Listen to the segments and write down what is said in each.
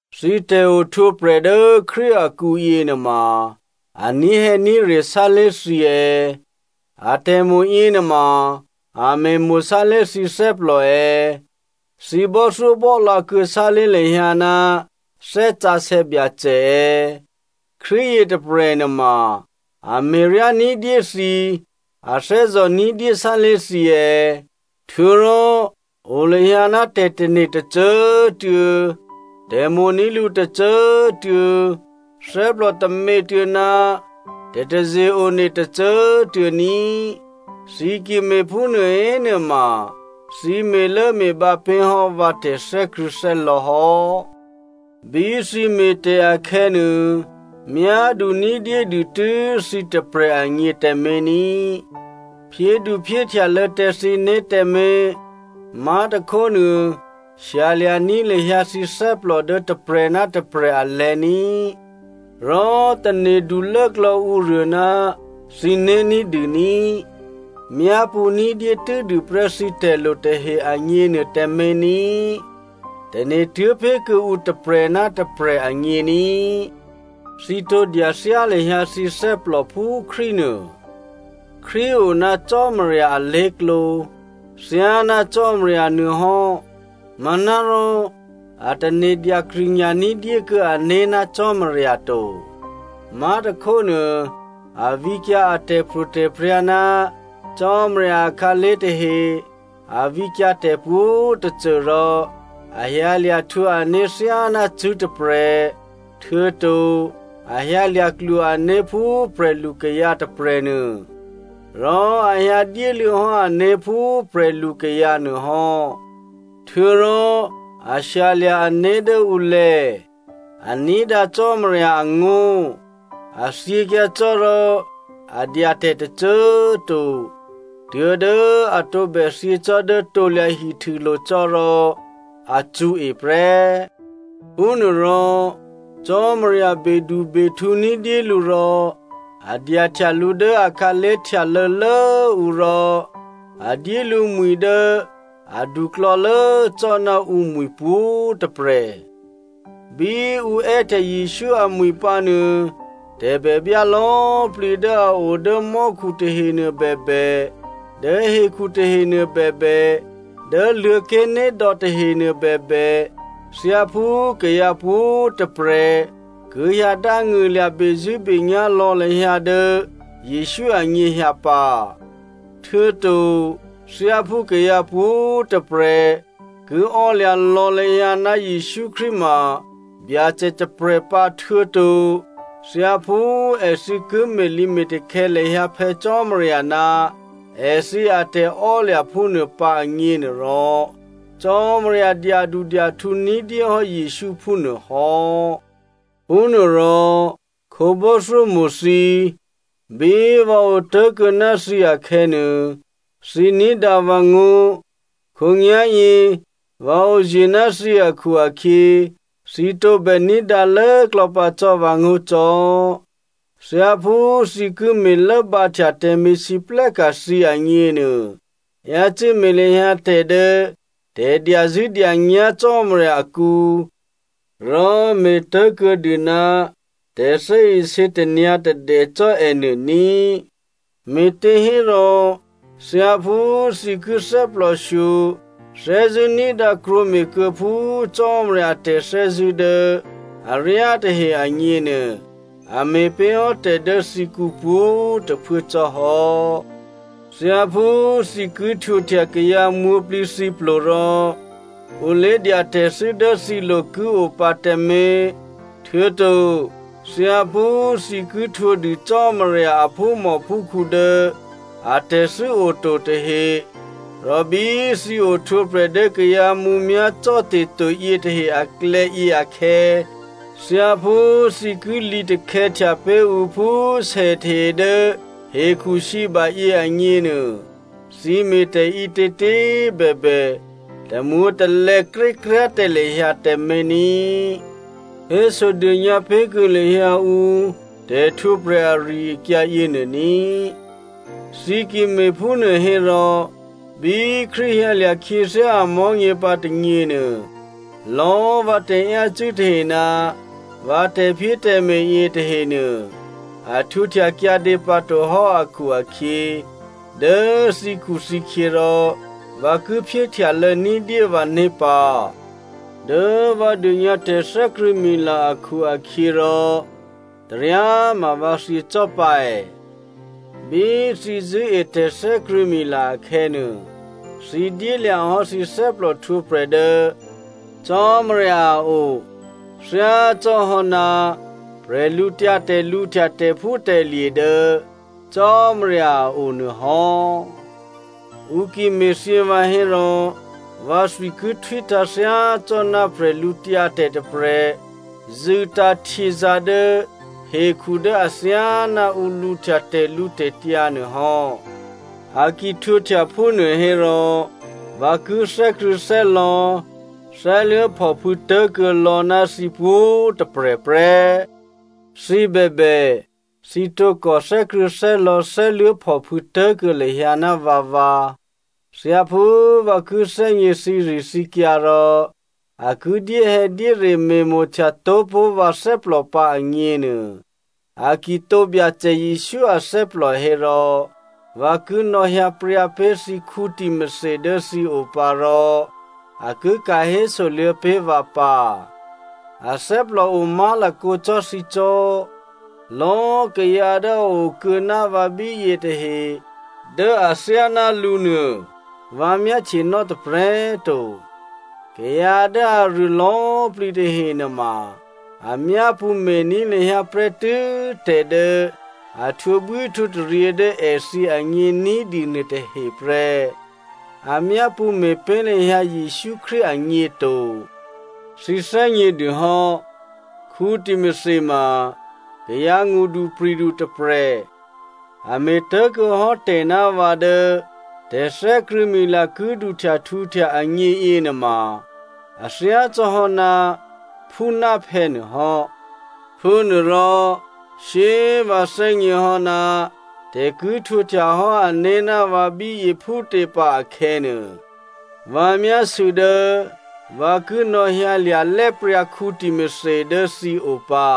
Thǐ tè̤ohtwǒprè̤ dố Krístu akǔ yěnuôma, a ní̤hè̌ní̤re sálé̤ thǐ è̌? Atè̤mo̤ yěnuôma a me̤mo̤ sálé̤ thǐ thè́plò è̌? Thǐ bò́thyóbò́lǎ kuô̌ sálé̤ lahyǎ ná Thè́ Sǎsè̌ Byacè è̌? Krístu yětôprè̤ nuôma a me̤ryá ní̤dyé thǐ, a thè́zò̤ ní̤dyé sálé̤ thǐ è̌? Htuô̌rò, o lahyǎ ná tè̤tane̤ tôcô꤮ tuô̌, tè̤mo̤ní̤ lǔ tôcô꤮ tuô̌, thè́plò tômětuô̌ ná tè̤taze-one tôcô꤮ tuô̌ ní꤮. Thǐ ki me̤phúnuô hénuôma thǐ me̤lốme̤bǎ pé̤ hò́ vǎ tè̤thè́krṳ̂̌thè́lò̤̌ hò́. Bí thǐ me̤tè̤ akhè̌nuô, myádu ní̤dyédû tû́ thǐ tôprè̤ agně tǎmé̤ ní, phyéduphyéhtyalô̌ tǎ thǐné̤ tǎmé̤, má̤tôkhónuô shyalya̤ní̤ lahyǎ thǐ thè́plò dố tôprè̤ ná tôprè̤ alè̤̌ ní꤮, rò tane̤du lốklò̌ ǔruô ná thǐné̤ ní̤dû ní꤮. Myápṳ̌ ní̤dyé tû́dûprè́ thǐ tè̤lo tahe agněnuô tǎmé̤ ní, tane̤ tuố̤ pé̤ kuô̌ǔ tôprè̤ ná tôprè̤ agně ní꤮. Thǐ tǒ dya thyá lahyǎ thǐ thè́plò phú Krístunuô. Krístu o ná Cò́marya alé̤klǒ thyáná Cò́marya nuôhò́ manárò a tane̤ dyakrṳ̂nya̤ ní̤dyékuô̌ ané̤ ná Cò́marya to. Má̤tôkhónuô, a vǐkyǎ a tè̤pro̤tè̤prya̤ ná Cò́marya akhǎlé̤ tahe, a vǐkyǎ tè̤pwǒ̤tôcô, rò a hyǎlya̤ htwǒ ané̤ thyáná cṳ̂́ tôprè̤, htuô̌to a hyǎlya̤ klwo ané̤ phú prè̤lukayǎ tôprè̤nuô. Rò a hyǎ dyéluô̌ hò́ ané̤ phú prè̤lukayǎ nuôhò́, htuô̌rò, a shyalya̤ ané̤ dố ǔlè̤̌. A ní̤dǎ Cò́marya angó̤, a thyěkyǎ cò́ rò a dya tè̤ tôcô꤮ to. Tuố̤dố a tǒbè thyě cò́ dố krusulo̤ cò́ rò a cṳ̌e prè́. Phúnuôrò Cò́marya bedubehtǔ ní̤dyé lǔ rò a dyahtya lǔ dố akhǎlé̤ htyalô̌lốǔ rò a dyé lǔ mwi̤ dố aduklò̌lố cò́ ná ǔmwi̤ pwǒ̤꤮ tôprè̤. Bí ǔ è́htya Jesǔ amwi̤ pǎnuô tè̤bèbyá lò̌꤮ plǐ dố a o dố mò́khu tahenuô bèbè, dố hekhu tahenuô bèbè, dố Luô̤̌ké̤nédò̌ tahenuô bèbè, thyáphú kayǎ pwǒ̤꤮ tôprè̤ ki hyǎ dángṳ̂lya̤ bezṳ̂́benyá̤ lò̌ lahyǎ dố Jesǔ anyěhyǎ pǎ, htuô̌to thyáphú kayǎ pwǒ̤꤮ tôprè̤ ki ò́lya̤ lò̌ lahyǎ ná Jesǔ Krístu ma Byacè tôprè̤ pǎ htuô̌to thyáphú èthǐ ki me̤lǐme̤takhè̌ lahyǎ Phè̌ Cò́marya ná èthǐ atè̤ò́lya̤ phúnuô pǎ agněnuôrò, Cò́marya dyadudyahtǔ ní̤dyéhò́ Jesǔ phúnuô hò́. Phúnuôrò, khǒbò́thyómo̤ thǐ꤮ bí vǎ otố̤kuô̌ ná thǐ akhè̌nuô, thǐ ní̤dǎ vǎ ngó̤, khǒnyá̤yě vǎ oye̤ ná thǐ akhu-akhyě, thǐ tǒbè ní̤dǎ lốklò̌ pǎ cò́ vǎngó̤ cò́. Thyáphú thǐ ki me̤lốbǎhtya tè̤me̤lwóhteka̤ thǐ agněnuô, yácû́ me̤ lahyǎ tè̤ dố tè̤dyazṳ̂́dyanyá̤ Cò́marya akǔ, rò me̤ tố̤kuô̌dû ná tè̤thè́isě tanyǎ̤tadè cò́ ènuô ní꤮. Me̤těhérò, thyáphú thǐ ki thè́plòshyo thè́zṳ̂́ ní̤dǎ krwǒme̤ kuô̌ phú Cò́marya a tè̤thè́zṳ̂́ dố aryá tahe agněnuô, a me̤ pé̤hò́ tè̤ dố thǐkǔ pwǒ̤꤮ tôphuố cò́ hò́. Thyáphú thǐ ki htwǒhtya kayǎ mwǒ̤plǐthǐplo rò ǔ lé̤dya tè̤thû́ dố thǐlo̤ ki o pǎ tǎmé̤, htuô̌to thyáphú thǐ ki htwǒdû Cò́marya a phúmòphúkhǔ dố atè̤thû́ o to tahe, rò bí thǐ ohtwǒprè̤ dố kayǎ mǔmyá̤ cò́te̤to yětahe aklè̌ yěakhè̌, thyáphú thǐ ki lǐtakhè̌htya pé̤ ǔ phú sètahe dố hekhusǐba yěanyěnuô, thǐ me̤tè̤ ǐtětě꤮ bèbè, tamwǒ̤talè̌ krékryá̤ tǎ lahyǎ tǎmé̤ ní꤮. Hésodônyǎ pé̤kuô̌ lahyǎ ǔ tè̤htwǒprè̤ ari-akyǎ yěnuô ní꤮. Thǐ ki me̤phúnuô hérò bí Krístu hyǎlya̤ khyěthyá amò̤́nyě pǎ tônyěnuô, lò̌꤮ vǎ tè̤yácû́ tahe ná vǎ tè̤phyétè̤me̤ yětahenuô a htwǒhtya kyǎdě pǎtohò́ akhu-akhyě, dố thǐkhuthǐkhyě rò vǎ ki phyéhtyalô̌ ní̤dyé vǎné̤ pǎ. Dố vǎ dônyǎ tè̤thè́krṳ̂̌mila akhu-akhyěrò taryáma vǎ thyě cò́ pǎ è. Bí thǐ zṳ̂́e tè̤thè́krṳ̂̌mila akhè̌nuô, thǐ dyélya̤ hò́ thǐ thè́plòhtwǒprè̤ dố Cò́marya a o thyácò́hò́ná bwídu lǔhtya tè̤phútè̤lye̤ dố Cò́marya a o nuô hò́. Ǔ ki me̤thyě vǎ hérò, vǎthwi ki htwítǎ̤ thyácò́ná bwídu tôprè̤ zṳ̂tǎ̤ htyězǎ̤ dố hekhu dố athyáná ǔ lǔhtya tè̤lǔtè̤tyǎ nuôhò́. A ki htwǒhtya phúnuô hérò vǎ ki thè́krṳ̂̌thè́lò̌, thè́luố̤phòphû̌ tố̤kuô̌ lò̌ ná thǐ pwǒ̤꤮ tôprè̤ prè́. Thǐ bèbè, thǐ tǒkò thè́krṳ̂̌thè́lò̌, thè́luố̤phòphû̌ tố̤kuô̌ lahyǎ ná vǎvǎ. Thyáphú vǎ ki thè́gně thǐrithǐkyǎ rò a ki dyéhè̌dyére me̤mo̤htyató̤ pó̤ vǎ thè́plò pǎ agněnuô, a ki tǒ Byacè Jesǔ athè́plò hérò vǎ ki nò̌hyǎ pryǎ pé̤ thǐ Timothy dố thǐ o pǎ rò a ki ka̤ hésoluô̌ pé̤ vǎ pǎ. Athè́plò o má̤lakǒ cò́ thǐ cò́. Lò̌꤮ kayǎ dố a o kuô̌ ná vǎ bíyě tahe dố athyáná lǔnuô vǎ myáhtyenò́ tôprè̤꤮ to. Kayǎ dố aruô lò̌꤮ plǐ tahe nuôma a myápṳ̌ me̤ní̤ lahyǎ prè́tû́ tè̤ dố a htwǒbwíhtwǒtaryě dố èthǐ agně ní̤dû nuôtahe prè́. A myápṳ̌ me̤ pé̤ lahyǎ Jesǔ Krístu agně to. Thǐ thè́gnědûhò́, Timothy ma kayǎ ngṳdupri̤du tôprè̤. A me̤tố̤kuô̌ hò́ tè̤ ná vǎ dố tè̤thè́krṳ̂̌mila ki duhtyahtǔhtya agně yěnuôma a thyácò́hò́ ná phú ná phè̌ nuôhò́. Phúnuôrò shyé꤮ vǎ thè́gněhò́ ná tè̤ ki htwǒhtya hò́ ané̤ ná vǎ bíyě phútě pǎ akhè̌nuô, vǎ myásû̌ dố vǎ ki nò̌hyǎlya̤ lè̤́pryǎ Timothy dố thǐ o pǎ.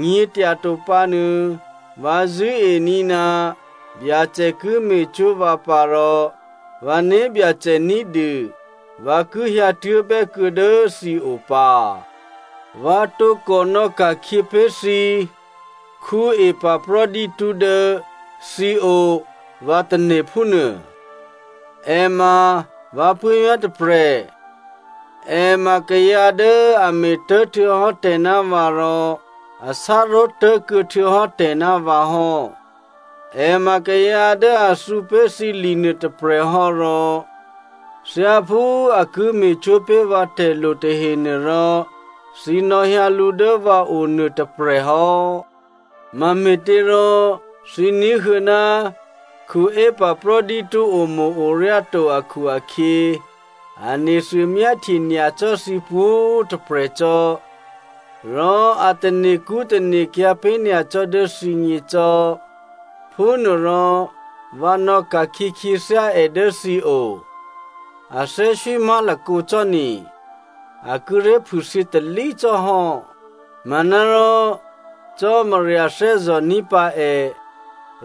Nyě̤tyato pǎnuô, vǎ zṳ̂́ení̤ ná Byacè ki me̤cwó̤ vǎ pǎ rò vǎ né̤byacè ní̤dû, vǎ ki hyǎtuố̤bè́ kuô̌ dố thǐ o pǎ. Vǎ tǒkò nò̌ka̤khyě pé̤ thǐ Epaphrodito dố thǐ o vǎ tane̤ phúnuô. È ma vǎ puố̤vyá̤ tôprè̤, è ma kayǎ dố a me̤tố̤ htuô̌hò́ tè̤ ná vǎ rò a sá ró̤tố̤kuô̌ htuô̌hò́ tè̤ ná vǎ hò́. È ma kayǎ dố a thǔ pé̤ thǐ li nuôtôprè̤ hò́ rò thyáphú a ki me̤cwó̤ pé̤ vǎ tè̤lo tahenuô rò thǐ nò̌hyǎ lǔ dố vǎ o nuôtôprè̤ hò́. Mame̤těrò thǐ ní̤huô̌ ná Epaphrodito omo̤-oryá to akhu-akhyě a nethuô myáhtye nyacò́ thǐ pwǒ̤꤮ tôprè̤ cò́, rò a tane̤kṳ́ tane̤kyǎ̤ pé̤ nyacò́ dố thǐgně cò́, phúnuôrò vǎ nò̌ka̤khyě khyěthyá è dố thǐ o. A thè́swí má̤lakǒ cò́ ni, a kíré̤ phûthyě talí cò́ hò́. Manárò Cò́marya thè́zò̤ní̤ pǎ è,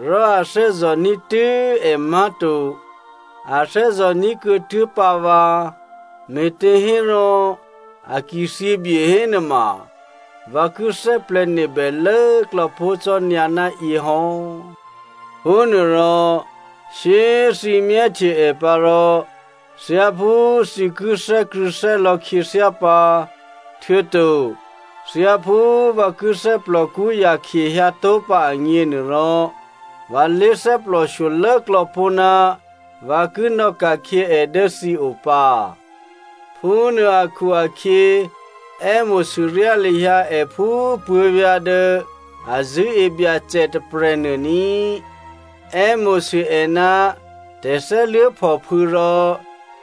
rò a thè́zò̤ní̤ tû́ è má̤to, a thè́zò̤ní̤ kuô̌tuố̤ pǎ vǎ. Me̤těhérò a ki thyěbye hénuôma, vǎ ki thè́plè̤̌nebè lốklò̌ pó̤ cò́ nyǎ ná yě hò́. Phúnuôrò, shyé꤮ thǐ myáhtye è pǎ rò, thyáphú thǐ ki thè́krṳ̂̌thè́lò̌ khyěthyá pǎ, htuô̌to thyáphú vǎ ki thè́plòkṳ́ yakhye hyǎtó̤pǎ agněnuôrò, vǎ lé thè́plò shyolốklò̌ pó̤ ná vǎ ki nò̌ka̤khyě è dố thǐ o pǎ. Phúnuô akhu-akhyě, è́mo̤sûryá lahyǎ è phú puố̤vyá̤ dố a zṳ̂́e Byacè tôprè̤nuô ní꤮. È́mo̤sû è ná tè̤thè́luố̤phòphû̌ rò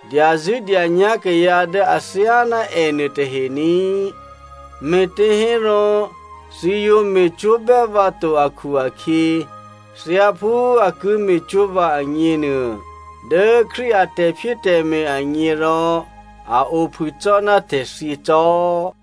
dyazṳ̂́dyanyá̤ kayǎ dố athyáná ènuô tahe ní꤮. Me̤těhérò, thǐ yǒ me̤cwó̤bè́ vǎ to akhu-akhyě, thyáphú a ki me̤cwó̤ vǎ agněnuô, dố Krístu a tè̤phyétè̤me̤ agně rò, a ophû cò́ ná tè̤thyě cò́.